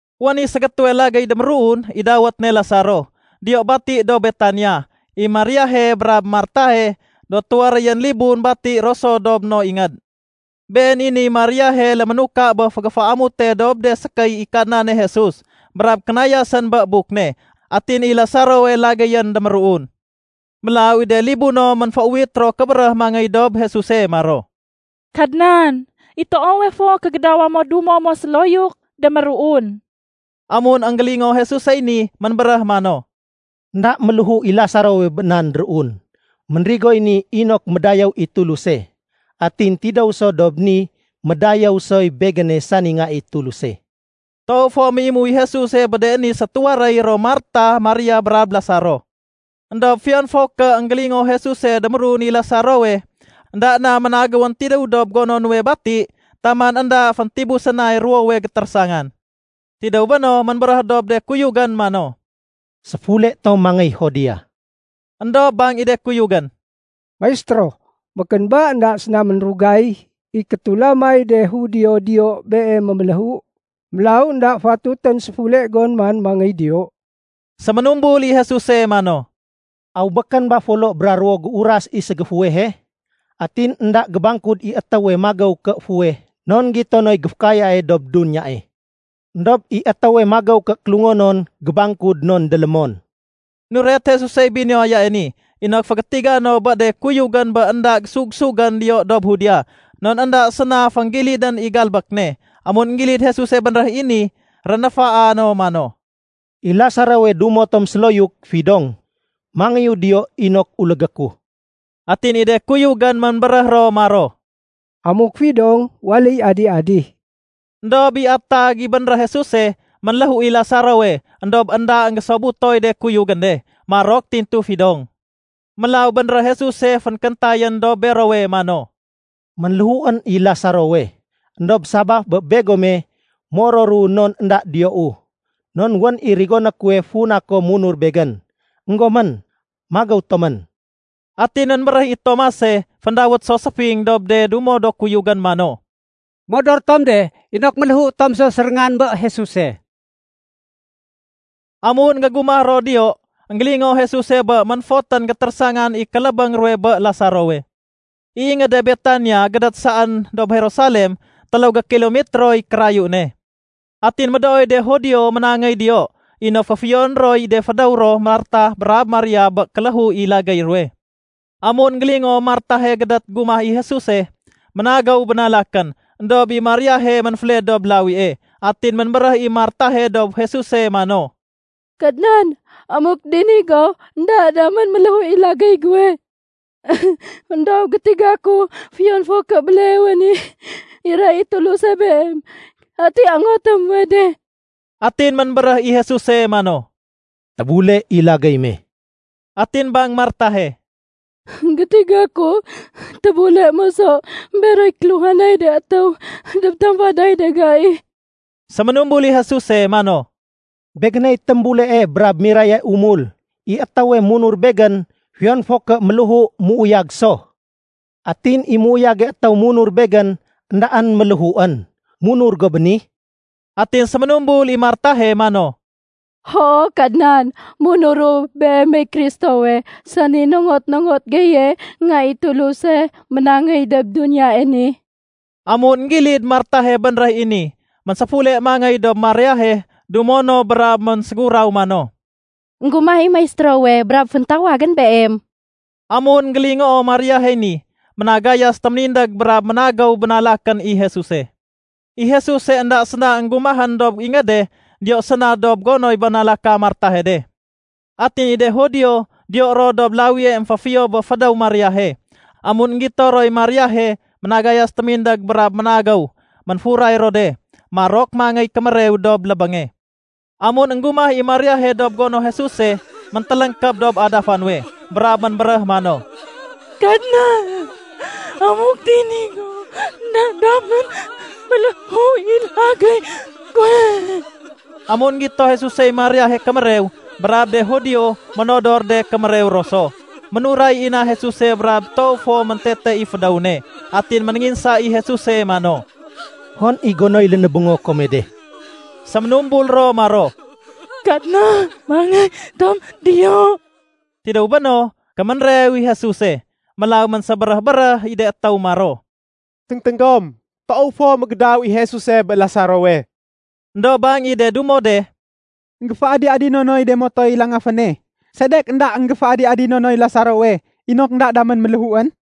Wén i ségétéwe lagéy déméruun, i dawét ne Lasaro, diyo bati dob Betania. I Mariahe brab Martahe do tuwaréyén libun bati ro so dob no ingéd. Been i niy Mariahe léménuka bé fégéféamute dob de sékéy i Kadnane Jesus brab kénayasén bé buk ne. Atin i Lasarowe lagéyén déméruun. Mélaw i de libuno ménféuwit ro kébéréh mangéy dob Jesuse maro, “Kadnan, i toowe fo kégédawa mo dumo mo séloyuk, déméruun.” Amun énggélingoo Jesusey ni, ménbéréh mano, “Enda méléhu i Lasarowe bé nan déruun. Ménrigoy ni inok médayéw i Tuluse, atin tidéw so dob ni médayéw soy Begéne sani Nga i Tuluse.” Toow fo méimu i Jesuse bé de ni sétuwaréy ro Martah, Maria, brab Lasaro. Endob fiyon fo ké énggélingoo Jesuse déméruun i Lasarowe, énda na ménagéwén tidéw dob gono nuwe bati taman énda féntibusén nay ruwowe gétérésangan. Tidéw béno, ménbéréh dob de kuyugén mano, “Séfule tom mangéy Judea.” Endob bang i de kuyugén, “Maistéro, békén ba énda séna ménrugay i kétulamay de Judio diyo Beem méméléhu? Mélaw énda fatutén séfule gon man mangéy diyo.” Séménumbul i Jesuse mano, “Aw békén ba folo bra ruwo géuras i ségéfuwehe? Atin énda gébangkud i étéwe magéw ké fuweh non gito noy géfékayae dob duniyae. Endob i étéwe magéw ké kélungonon gébangkud non délémon.” Nuret Jesusey binuwayae ni inok fégétiga no bé de kuyugén bé énda gésug-sugén diyo dob Judea non énda séna fénggilidén i galbék ne. Amun énggilid Jesuse bénréh i ni, rénéfaa no mano, “I Lasarowe dumo tom séloyuk, fidong. Mangéyu diyo inok ulégé ku.” Atin i de kuyugén ménbéréh ro maro, “Amuk fidong, waléy adi-adi.” Endob i atag i bénréh Jesuse, ménléhu i Lasarowe, éndob énda énggésobutoy de kuyugén de. Marok tintu fidong. Mélaw bénréh Jesuse fénkéntayén dob berowe mano, “Ménléhuén i Lasarowe. Endob sabaf bé begome, mororu non énda diyou. Non wén i rigoné kuwe funa kom munur Begén. Enggomén, magéw tomén.” Atin ménbéréh i Tomase (féndawét so “Séfing”) dob de dumo no kuyugén mano, “Modor tom de inok méléhu tom so séréngan bé Jesuse.” Amun énggégumah ro diyo, énggélingoo Jesuse bé ménfotén gétérésangan i kélébéng ruwe bé Lasarowe. I ingéde Betania, gédét saén dob Jerusalem, téléw gékilomitroy kérayu ne. Atin médooy de Judio ménangéy diyo inok féfiyoné roy de fédéw ro Martah brab Maria bé kéléhu i lagéy ruwe. Amun énggélingoo Martahe gédét gumah i Jesuse, ménagéw bénalakén, éndob i Mariahe ménféled dob lawie. Atin ménbéréh i Martahe dob Jesuse mano, “Kadnan, amuk dini go, énda damén ménléhu i lagéy guwe. Endob gétiga ku fiyon fo ké béleewe ni, iray i Tuluse Beem i ati ongoté muwe de.” Atin ménbéréh i Jesuse mano, “Tébule i lagéy me.” Atin bang Martahe, “Gétiga ku tébule moso beroy kéluhanay de étéw dob tamfaday de gai.” Séménumbul i Jesuse mano, “Begéney témbulee brab miraye umul. I étéwe munur Begén, fiyon fo ké méléhu, méuyag so. Atin i méuyage étéw munur Begén, éndaén méléhuén. Munur go bé ni?” Atin séménumbul i Martahe mano, “Hoo Kadnan, munuru Beemey Kristowe, sani nongot-nongot geye Nga i Tuluse ménangéy dob duniyae ni.” Amun énggilid Martahe bénréh i ni, ménséfule mangéy dob Mariahe dumo no brab ménséguraw mano, “Enggumah i Maistérowe brab féntawagén beem.” Amun énggélingoo Mariahey ni, ménagayas témindég brab ménagéw bénalakén i Jesuse. (I Jesuse énda séna énggumahén dob ingéde, diyo séna dob gonoy bénalaka Martahe de.) Atin i de Judio diyo ro dob lawie émféfiyo bé fédéw Mariahe, amun énggito roy Mariahe ménagayas témindég brab ménagéw, ménfuray ro de. Marok mangéy kémérew dob lébénge. Amun énggumah i Mariahe dob gono Jesuse, méntéléngkéb dob adafa nuwe brab ménbéréh mano, “Kadnan, amuk dini go, énda damén ménléhu i lagéy guwe.” Amun énggito Jesusey Mariahe kémérew brab de Judio ménodor de kémérew ro so, ménuray i na Jesuse brab toow fo méntete i fédéw ne. Atin ménénginsa i Jesuse mano, “Hon i gonoy lénébéngo kome de?” Séménumbul ro maro, “Kadnan, mangéy tom diyo.” Tidéw béno, kéménrew i Jesuse. Mélaw ménsébéréh-béréh i de étéw maro, “Téngténg gom, toow fo mégédaw i Jesuse bé Lasarowe.” Endob bang i de dumo de, “Enggéféadi-adino noy de motoy langaféne. Sedek énda énggéféadi-adino noy Lasarowe inok énda damén ménléhuén?”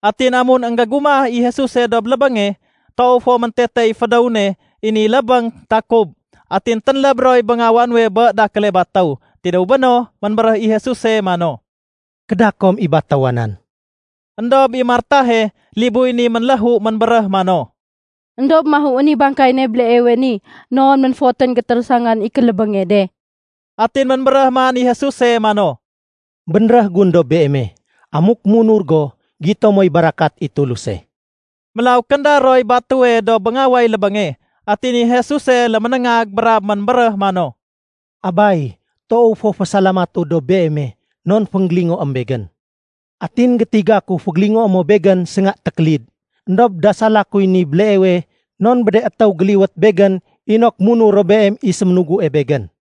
Atin amun énggégumah i Jesuse dob lébénge, toow fo méntete i fédéw ne. I ni lébéng takub, atin ténléb roy béngawa nuwe bé dakéle batéw. Tidéw béno, ménbéréh i Jesuse mano, “Kéda kom i batéwa nan.” Endob i Martahe, libuy ni ménléhu ménbéréh mano, “Endob mahuén i bangkay ne béleewe ni, non ménfotén gétérésangan i kélébénge de.” Atin ménbéréh man i Jesuse mano, “Bénréh gun dob beeme, amuk munur go, gito moy barakat i Tuluse.” Mélaw kénda roy batéwe dob béngaway lébénge. Atin i Jesuse léménéngag brab ménbéréh mano, “Abay, toow fo fésalamatu dob Beeme non fénggélingoém Begén. Atin gétiga ku fégélingoé mo Begén sénga tékélid. Endob dasala kuy ni béleewe non bé de étéw géliwét Begén inok munur ro Beem i séménugue Begén.”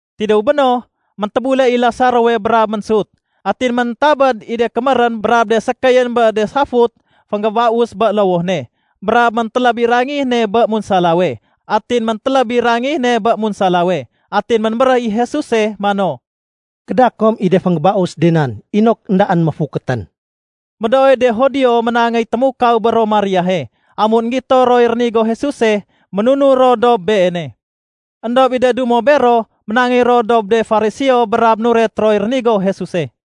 Tidéw béno, méntébule i Lasarowe brab ménsut. Atin méntabéd i de kémérén brab de sékéyén bé de safut fénggébaus bé lowoh ne, brab méntéléb i rangih ne bé munsalawe. Atin ménbéréh i Jesuse mano, “Kéda kom i de fénggébaus de nan inok éndaén méfukétén.” Médooy de Judio ménangéy témukaw bé ro Mariahe, amun énggito roy rénigo Jesuse, ménunur ro dob Beene. Endob i de dumo bero, ménangéy ro dob de Fariseo brab nuret roy rénigo Jesuse.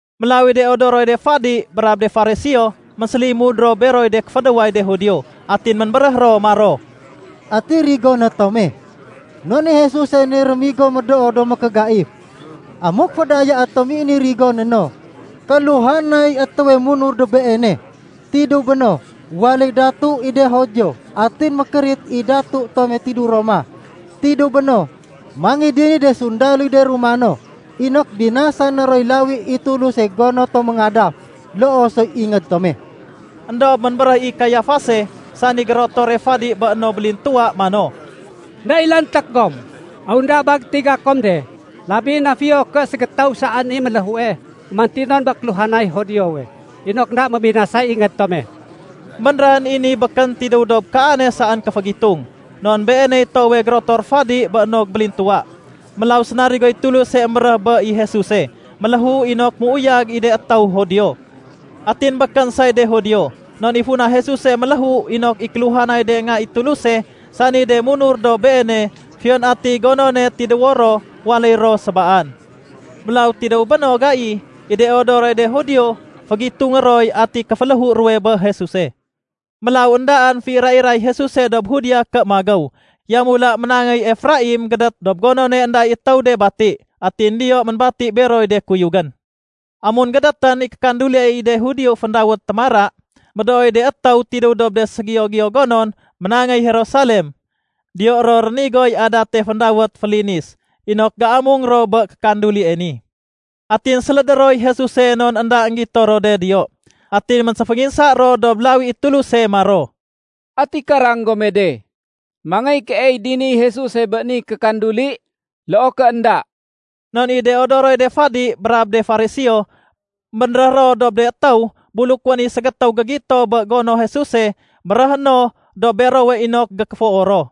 Mélaw i de odoroy de fadi brab de Fariseo, ménsélimud ro beroy de kéfédéway de Judio. Atin ménbéréh ro maro, “Ati rigoné tome? Non i Jesuse ni rémigo médoo do mékégaif. Amuk fédayaé tom i ni rigoné no, kéluhanay étéwe munur dob Beene. Tidéw béno, waléy datu i de Judio atin mékérit i datu tome tidéw Roma. Tidéw béno, mangéy diniy de sundaloy de Romano inok binasané roy lawi i Tuluse gono tom méngadaf, loo soy ingéd tome.” Endob ménbéréh i Kayafase, sani gérotore fadi bé no bélintuwa mano, “Enda i lanték gom. Aw énda ba gétiga kom de, labi na fiyo ké ségétéw saén i méléhue gémantinon bé kéluhanay Judiowe, inok énda mébinasay ingéd tome?” Bénréhén i ni békén tidéw dob kaane saén kéfégitung. Non beeney toowe gérotor fadi bé no bélintuwa, mélaw sénarigoy Tuluse émbéréh bé i Jesuse méléhu inok méuyag i de étéw Judio. Atin békén say de Judio, non i funa Jesuse méléhu inok i kéluhanay de nga i Tuluse, sani de munur dob Beene, fiyon atiy gonone tidéwo ro, waléy ro sébaan. Mélaw tidéw bé no gai, i de odoroy de Judio fégitungé roy ati kéféléhu ruwe bé Jesuse. Mélaw éndaén féira-iray Jesuse dob Judea ké magéw. Yamula ménangéy Efraim gédét dob gonone énda i étéw de bati. Atin diyo ménbati beroy de kuyugén. Amun gédétén i kékanduli i de Judio féndawét “Témara”, médooy de étéw tidéw dob de ségiyo-giyo gonon ménangéy Jerusalem. Diyo ro rénigoy adate féndawét “Félinis” inok géamung ro bé kandulie ni. Atin sélédé roy Jesuse non énda énggito ro de diyo. Atin ménséfénginsa ro dob lawi i Tuluse maro, “Ati karang gome de, mangéy keey diniy Jesuse bé ni kékanduli, loo ké énda?” Non i de odoroy de fadi brab de Fariseo, bénréh ro dob de étéw buluk wén i ségétéw gégito bé gono Jesuse, béréhé no dob berowe inok gékéfoo ro.